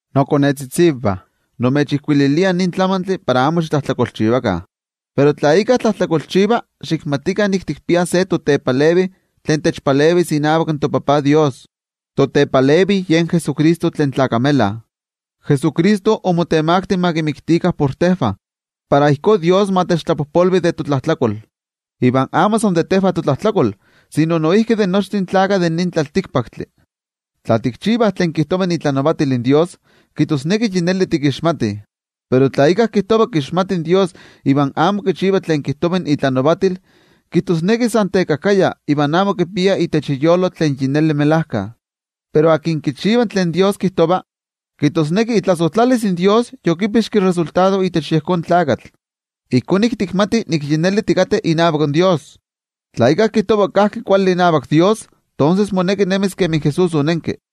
Nokonetzitzivah, nimechijkuililia nin tlamantli para amo xitlajtlakolchivakah. Pero tla íkka tlajtlakolchiva, xikmatikah nik tikpiah se totepalevi tlen techpalevis inavak toTajtzin Dios. Totepalevi yen Jesucristo tlen tlakamela. Jesucristo omotemakti ma kimiktikah por tejvah, para ijkó Dios ma techtlapojpolvi de totlajtlakol, iva amo san de tejvah totlajtlakol, sino noijki de nochtin tlaltikpaktlakah. Tla tikchivah tlen kijtova itlanavatil in toYejwatzi, kijtosneki yi neli tikixmatih. Pero tla íkka kijtova kixmati Dios iva amo kichiva tlen kijtova itlanavatil, kijtosneki san tekajkaya iva amo kipia itech iyolo in melajkayotl. Pero tlen kichiva tlen toYejwatzi kijtova, kijtosneki itlasojtlalis in toYejwatzi motlami yektik itech yejón tlakatl. Ijkó nik tikmatih nik yi neli tikateh inavak toYejwatzi. Tla íkka kijtova kajki kuali inavak toYejwatzi, tonses moneki nemis kemi Jesús onenki.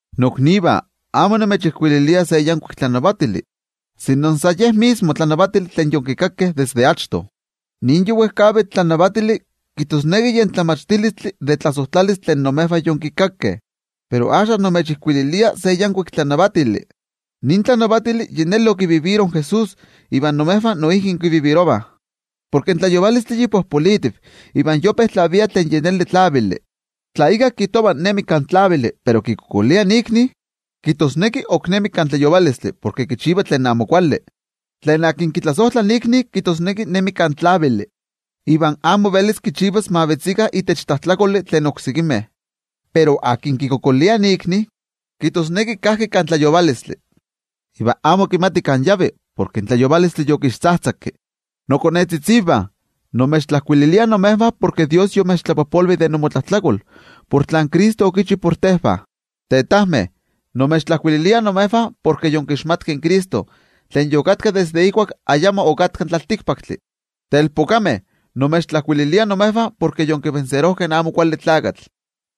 Noknivah, amo nimechijkuililia se yankuik tlanavatili, sino san yen mismo in tlanavatili tlen yonkikakeh desde achto. Nin yi wejkavitl tlanavatili, kijtosneki yen tlamachtilistli de tlasojtlalistli tlen imejvah yonkikakeh. Pero axka, nimechijkuililia se yankuik tlanavatili. Jesús onenki itech melajkayotl de nin tlanavatili iva imejvah noijki itech innemih. Porke in tlayovalotl yi popolitiv iva yope tlavia tlen yi neli tlavili. Tla íkka kijtova nemi kan tlavili, pero kikualankaita ikni, kijtosneki ok nemi kan tlayovalotl porke kichiva tlen amo kuali. Tlen kitlasojtla ikni, kijtosneki nemi kan tlavili, iva amo velis kichivas ma vetzikah itech tlajtlakoli in oksekimeh. Pero tlen kikualankaita ikni, kijtosneki kajki kan tlayovalotl, iva amo kimati kan yavi, porke in tlayovalotl yokixtzajtzakki. Nokonetzitzivah, nimechtlajkuililia imejvah porke toYejwatzi yomechtlapojpolvi de inmotlajtlakol por tlen Cristo okichi por tejvah. Tetajmeh, nimechtlajkuililia imejvah porke yonkixmatkeh in Cristo tlen ipa yokatka desde ijkuak ayamo okatka in tlaltikpaktli. Telpokameh, nimechtlajkuililia imejvah porke yonkitlanilijkeh in Amo Kuali Tlakatl.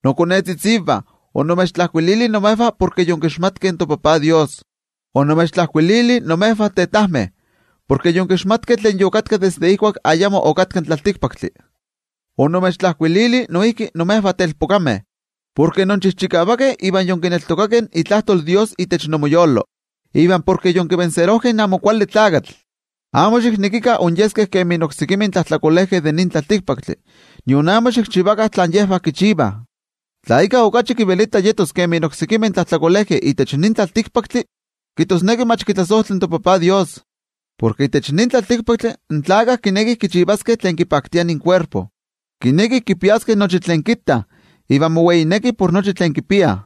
Nokonetzitzivah, onimechtlajkuilili imejvah porke yonkixmatkeh in toTajtzin Dios. Onimechtlajkuilili imejvah tetajmeh, porke yonkixmatkeh tlen ipa yokatka desde ijkuak ayamo okatka in tlaltikpaktli. Onimechtlajkuilili noijki imejvah telpokameh, porke inchijchikavakeh iva yonkineltokakeh itlajtol in toYejwatzi itech inmoyolo, iva porke yonkitlanilijkeh in Amo Kuali Tlakatl. Amo xiknekikah inyeskeh kemi oksekimeh tlajtlakolejkeh de nin tlaltikpaktli, nion amo xikchivakah tlen yejvah kichivah. Tla íkka okachi kivelita yetos kemi oksekimeh tlajtlakolejkeh itech nin tlaltikpaktli, kijtosneki mach kitlasojtla in toTajtzin Dios. Porke itech nin tlaltikpaktli in tlakah kinekih kichivaskeh tlen kipaktia inkuerpo, kinekih kipiaskeh nochi tlen kittah, iva moweinekih por nochi tlen kipiah.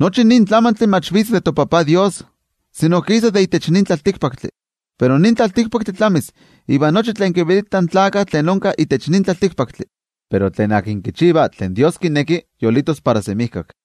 Nochi nin tlamantli mach vitz de toTajtzin Dios, sino kisa de itech nin tlaltikpaktli. Pero nin tlaltikpaktli tlamis iva nochi tlen kivelitah in tlakah tlen onka itech nin tlaltikpaktli. Pero tlen kichiva tlen toYejwatzi kineki yolitos para semijkak.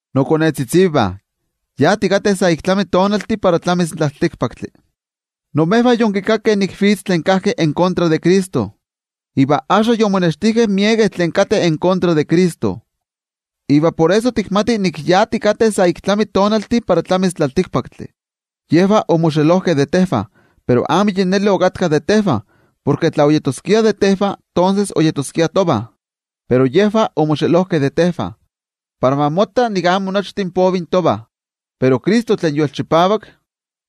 Nokonetzitzivah, yi tikateh sa ik tlami tonaltih para tlamis in tlaltikpaktli. Imejvah yonkikakeh nik vitz tlen tetlavelitak de Cristo. Iva axka yomonextijkeh miekeh tlen tetlavelitakeh de Cristo. Iva por eso tikmatih nik yi tikateh sa ik tlami tonaltih para tlamis in tlaltikpaktli. Yejvah omoxelojkeh de tejvah, pero amo yi neli okatkah de tejvah, porke tla oyeskiah de tejvah, tonses oyeskiah tovah. Pero yejvah omoxelojkeh de tejvah, para ma motta nik amo nochtin povih tovah. Pero Cristo tlen yolchipavak,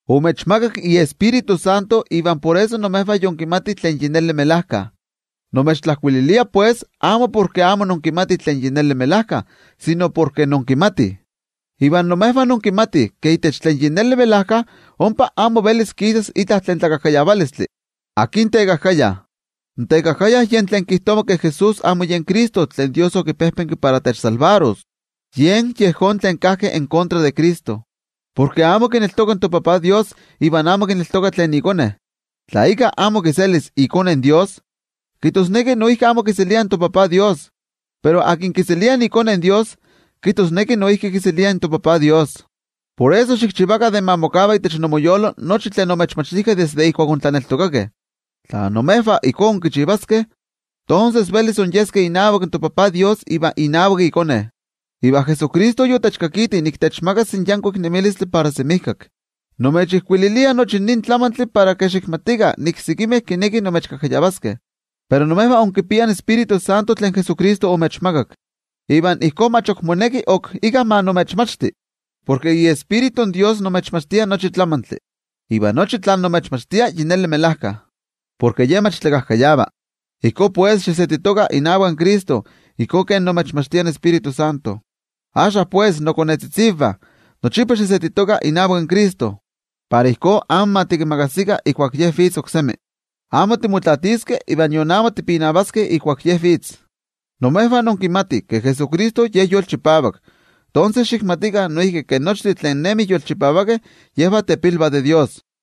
omechmakak iTioijyotzi, iva por eso imejvah yinkimatih tlen melajkayotl. Nimechtlajkuililia pues, amo porke amo inkimatih tlen melajkayotl, sino porke inkimatih. Iva imejvah inkimatih ke itech tlen melajkayotl ompa amo velis kisas itla tlakajkayavalistli. ¿Akin tekajkaya? In tekajkaya yen tlen kijtova ke Jesús amo yen Cristo tlen toYejwatzi okipejpenki para techmakixtis. Yen yejón tlen tetlavelitak de Cristo, porke amo kineltoka in toTajtzin Dios iva amo kineltoka tlen iKone. Tla íkka amo kiselis iKone in Dios, kijtosneki noijki amo kiselia in toTajtzin Dios. Pero tlen kiselia iKone in Dios, kijtosneki noijki kiselia in toTajtzin Dios. Por eso, xikchivakah de ma mokava itech inmoyolo nochi tlen omechmachtijkeh desde ijkuak ontlaneltokakeh. Tla imejvah ijkó inkichivaskeh, tonses velis inyeskeh inavak toTajtzin Dios iva inavak iKone. Iva Jesucristo yotechkakiti nik techmakas yankuik nemilistli para semijkak. Nimechijkuililia nochi nin tlamantli para xikmatikah nik sekimeh kinekih imechkajkayavaskeh. Pero imejvah inkipiah in Tioijyotzintli tlen Jesucristo omechmakak. Iva ijkó mach ok moneki ok íkka ma imechmachti, porke iTioijyotzi in Dios imechmachtia nochi tlamantli. Iva nochi tlen imechmachtia yi neli melajka, porke Ye mach tlakajkayava. Ijkó pues, xisetitokah inavak Cristo ijkó kemi imechmachtia in Tioijyotzintli. Axka pues, nokonetzitzivah, nochipa xisetitokah inavak Cristo. Para ijkó amo ma tikimakasikah ijkuak Ye vitz oksemi. Amo timotlaatiskeh iva nion amo tipinavaskeh ijkuak Ye vitz. Imejvah inkimatih ke Jesucristo Ye yolchipavak, tonses xikmatikah noijki ke nochtin tlen nemih yolchipavakeh, yejvah tepilvah de Dios.